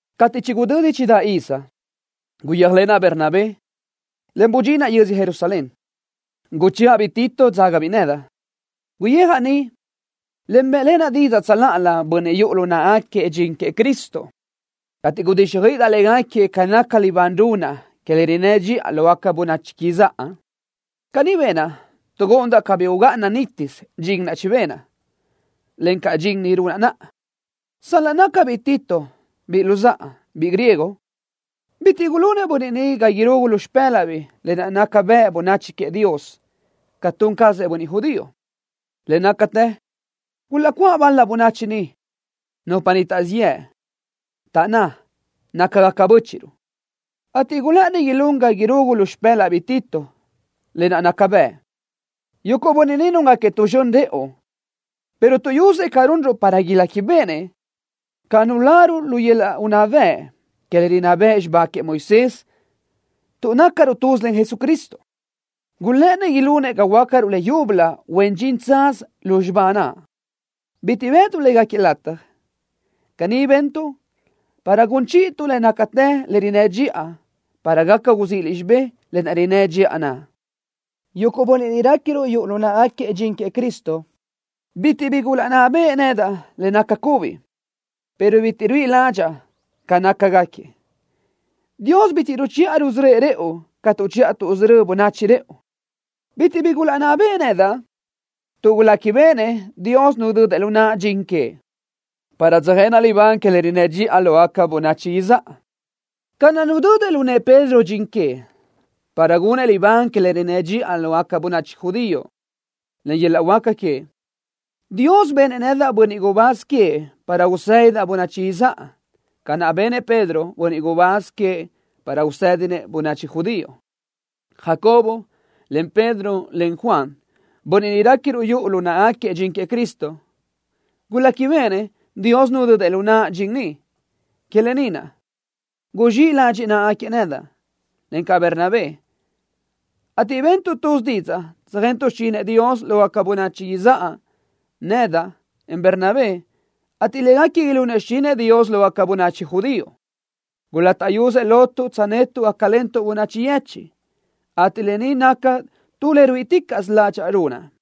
Cateʼ chigudödi chidáʼ iz, guyéajlenaʼ Bernabé, en budxinaʼ yödzö Jerusalén. Guchëʼa-biʼ Tito, dzágabiʼ nedaʼ. Guyijaʼ niʼ, en bëʼlenaʼ didzaʼ tsöláʼalö bönniʼ niʼ yuʼu lu náʼagaquiëʼ dxin queëʼ Cristo, ateʼ gudíxjöiʼidaʼ légaquiëʼ ca naca libán runaʼ que le rinnë́ dxiʼa lógaca bönachi izáʼa. Caní benaʼ tuʼ gúʼundaʼ cabí ugáʼana nítisö dxin naʼ chibenaʼ, encaʼ dxin ni runaʼ naʼa. Sal-laʼ nácabiʼ Tito, biʼi luzáʼa, biʼi griego, bitiʼ gulunëʼ bönniʼ ni ga irugu lu xpë́laʼbiʼ lë naʼ naca bëʼ bönachi queëʼ Dios ca tun cazëʼ bönniʼ judío. Le nácatë gulaʼcuáʼ bal-la bönachi niʼ, nupa niʼ taʼzíʼ yëʼ, taʼná nácagaca bö́chiʼruʼ, ateʼ gulë́ʼëni ilún ga irugu lu xpë́laʼbiʼ Tito lë naʼ naca bëʼ. Yuguʼ bönniʼ ni núngaquiëʼ tu zxön rëʼu pero tuʼyusëʼ ca runruʼ para iléquibeʼenëʼ ca nuláruʼ lu yöl-laʼ unná bëʼ que le rinná bëʼ xibá queëʼ Moisés tuʼ nácaruʼ tuz len Jesucristo. Gulë́ʼënëʼ ilunëʼ ga huöácaruʼ leyúbölö huen dxin tsaz lu xibá naʼ. Bitiʼ caʼ bëʼtuʼ légaquiëʼ lataj. Caní bentuʼ para gun chíʼituʼ le nácatë que le rinnë́ dxiʼa para gaca uzíʼiliʼ xibé le rinnë́ dxiʼa naʼ. Yuguʼ bönniʼ niʼ réquiruʼ yuʼu lu náʼagaquiëʼ dxin queëʼ Cristo bitiʼ bi gulaʼnná beʼe nedaʼ le naca cubi, pero bitiʼ ruíʼi ládxaʼa ca nácagaquiëʼ. Dios bitiʼ ruchiʼa rusörö́ëʼ rëʼu ca tuʼchiʼa tuʼsörö́ bönachi rëʼu. Bitiʼ bi gulaʼnná beʼe nedaʼ tuʼ guléquibeʼenëʼ Dios nudödëʼ lu naʼa dxin queëʼ, para tsöjenaʼ libán que le rinnë́ dxiʼa lógaca bönachi izáʼa, ca naʼ nudödëʼ lu nëʼë Pedro dxin queëʼ, para gunëʼ libán que le rinnë́ dxiʼa lógaca bönachi judío. Len yöl-laʼ huáca queëʼ, Dios benëʼ nedaʼ bönniʼ gubáz queëʼ para usédidaʼ bönachi izáʼa, ca naʼ benëʼ Pedro bönniʼ gubáz queëʼ para usédinëʼ bönachi judío. Jacobo, en Pedro, en Juan, bönniʼ niʼ réquiruʼ yuʼu lu naʼagaquiëʼ dxin queëʼ Cristo, guléquibeʼenëʼ Dios nudödëʼ lu naʼa dxin ni. Que lë ni naʼ guzxíʼ ladxiʼ náʼagaquiëʼ nedaʼ, encaʼ Bernabé, ateʼ bentuʼ tuz didzaʼ tsöjentuʼ xichinëʼ Dios lógaca bönachi izáʼa nedaʼ, en Bernabé, ateʼ légaquiëʼ ilunëʼ xichinëʼ Dios lógaca bönachi judío. Guláʼtaʼyusëʼ lotuʼ tsönetuʼ gácalentuʼ bönachi yechiʼ, ateʼ lë ni naca tu le ruíʼiticaʼsö ládxaʼa runaʼ.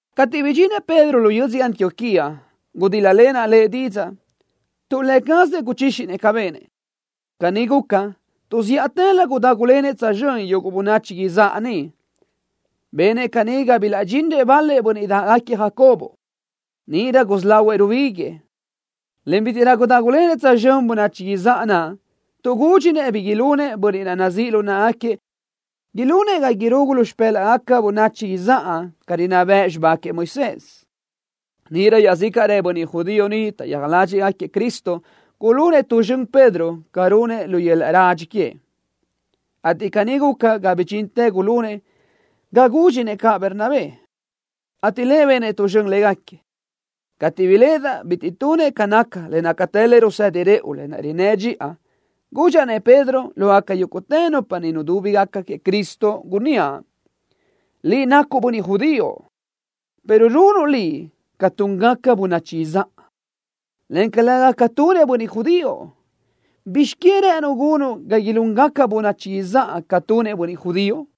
Cateʼ bidxinëʼ Pedro lu yödzö Antioquía, gudíl-lalenaʼ lëʼ didzaʼ tuʼ lë cazëʼ guchíxinëʼ ca benëʼ. Caní guca tuʼ zíʼatëlö gudágulenëʼ tsözxö́n yuguʼ bönachi izáʼa niʼ. Benëʼ caní ga bilaʼdxinrëʼ bal-la bönniʼ dáʼgaquiëʼ Jacobo. Níʼirö gusí lahuëʼ rubíguiëʼ, en bítiʼrö gudágulenëʼ tsözxö́n bönachi izáʼa naʼ tuʼ gúdxinëʼ bi ilunëʼ bönniʼ naʼ nazíʼ lu náʼagaquiëʼ ilunëʼ ga irugu lu xpë́laʼgaca bönachi izáʼa ca rinná bëʼ xibá queëʼ Moisés. Níʼirö iaʼzícaʼrëʼ bönniʼ judío niʼ taʼyija ládxëʼë Cristo gulunëʼ tu zxön Pedro ca runëʼ lu yöl-laʼ radxi queëʼ, ateʼ caní guca ga bidxintë gulunëʼ ga gúdxinëʼ caʼ Bernabé, ateʼ lëʼ benëʼ tu zxön légaquiëʼ. Cateʼ biléʼedaʼ bitiʼ tunëʼ ca naca le nácatë le rusedi rëʼu le rinnë́ dxiʼa, gudxaʼ-nëʼ Pedro lógaca yúguʼtë nupa niʼ nudúbigaca queëʼ Cristo, gunníaʼ: “Liʼ nacuʼ bönniʼ judío, pero runuʼ liʼ ca túngaca bönachi izáʼa, en calëga ca tunëʼ bönniʼ judío. ¿Bizx queë rë́ʼënuʼ gunuʼ ga ilúngaca bönachi izáʼa ca tunëʼ bönniʼ judío?”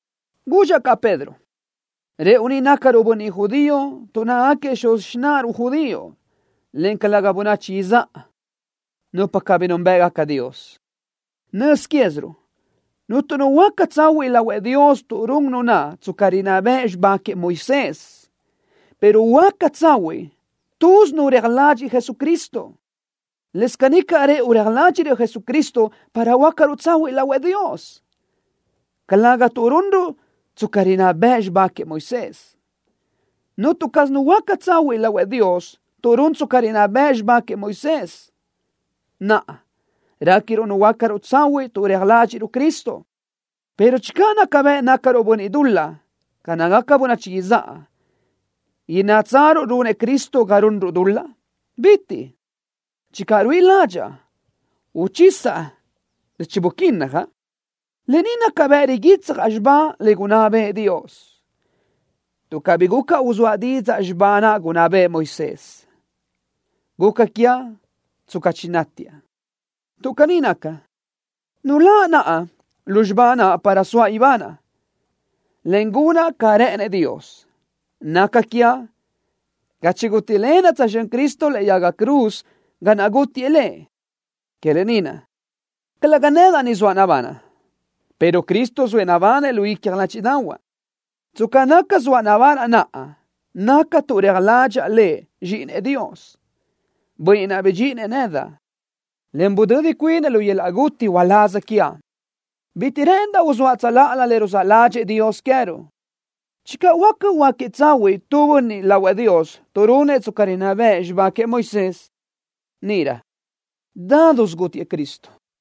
Gudxaʼ caʼ Pedro: “Rëʼu ni nácaruʼ bönniʼ judío tuʼ nácagaquiëʼ xuz xináʼaruʼ judío, en calëga bönachi izáʼa, nupa cabí núnbëʼgaca Dios. Nöz quéziruʼ cuntu nu huöáca tsahuiʼ lahuëʼ Dios tuʼ run nu naʼ tsca rinná bëʼ xibá queëʼ Moisés, pero huöáca tsahuiʼ tuzi nu naʼ reja ladxiʼ Jesucristo. Lës caní caʼ rëʼu reja ládxiʼruʼ Jesucristo para huöácaruʼ tsahuiʼ lahuëʼ Dios, en calëga tuʼ runruʼ tsca rinná bëʼ xibá queëʼ Moisés. Cuntu caz nu huöáca tsahuiʼ lahuëʼ Dios tuʼ run tsca rinná bëʼ xibá queëʼ Moisés. ’Naʼa, réquiruʼ nuhuöácaruʼ tsahuiʼ tuʼ reja ládxiʼruʼ Cristo, pero channö naca bëʼ nácaruʼ bönniʼ dul-laʼ ca nácagaca bönachi izáʼa, ¿innátsaruʼ runëʼ Cristo ga runruʼ dul-laʼ? ¡Bitiʼ caz! Channö ruíʼi ládxaʼa uchisaʼ le chibuquinjaʼ, lë ni naca bëʼ riguitsjaʼ xibá le gunná bëʼë Dios. Tuʼ cabí guca uzóaʼ didzaʼ xibá naʼ gunná bëʼë Moisés, guca quiaʼ tsca chinátiaʼ. Tuʼ caní naca, nuláʼ naʼa lu xibá naʼ para soaʼ ibanaʼ, en gunaʼ ca rë́ʼënëʼ Dios. Naca quiaʼ ca chigútilenaʼ tsözxö́n Cristo lëʼe yaga cruz ga naʼ gútiëʼ Lëʼ. Que lë ni naʼ calëga nedaʼ ni zoaʼ nabanaʼ, pero Cristo zoëʼ nabanëʼ lu icja ládxiʼdaʼahuaʼ. Tsca naca zoaʼ nabanaʼ naʼa, naca tuʼ reja ládxaʼa Lëʼ zxíʼinëʼ Dios, Bönniʼ naʼ bidxíʼinëʼ nedaʼ, en budödi cuinëʼ lu yöl-laʼ guti uláz quiaʼ nedaʼ. Bitiʼ rë́ʼëndaʼ uzóaʼ tsöláʼalö le ruzáʼ ládxëʼë queë́ruʼ Dios. Channö huáca huöáquiëʼ tsahuiʼ tu bönniʼ lahuëʼ Dios tuʼ runëʼ tsca rinná bëʼ xibá queëʼ Moisés, níʼirö nítisö gútiëʼ Cristo.”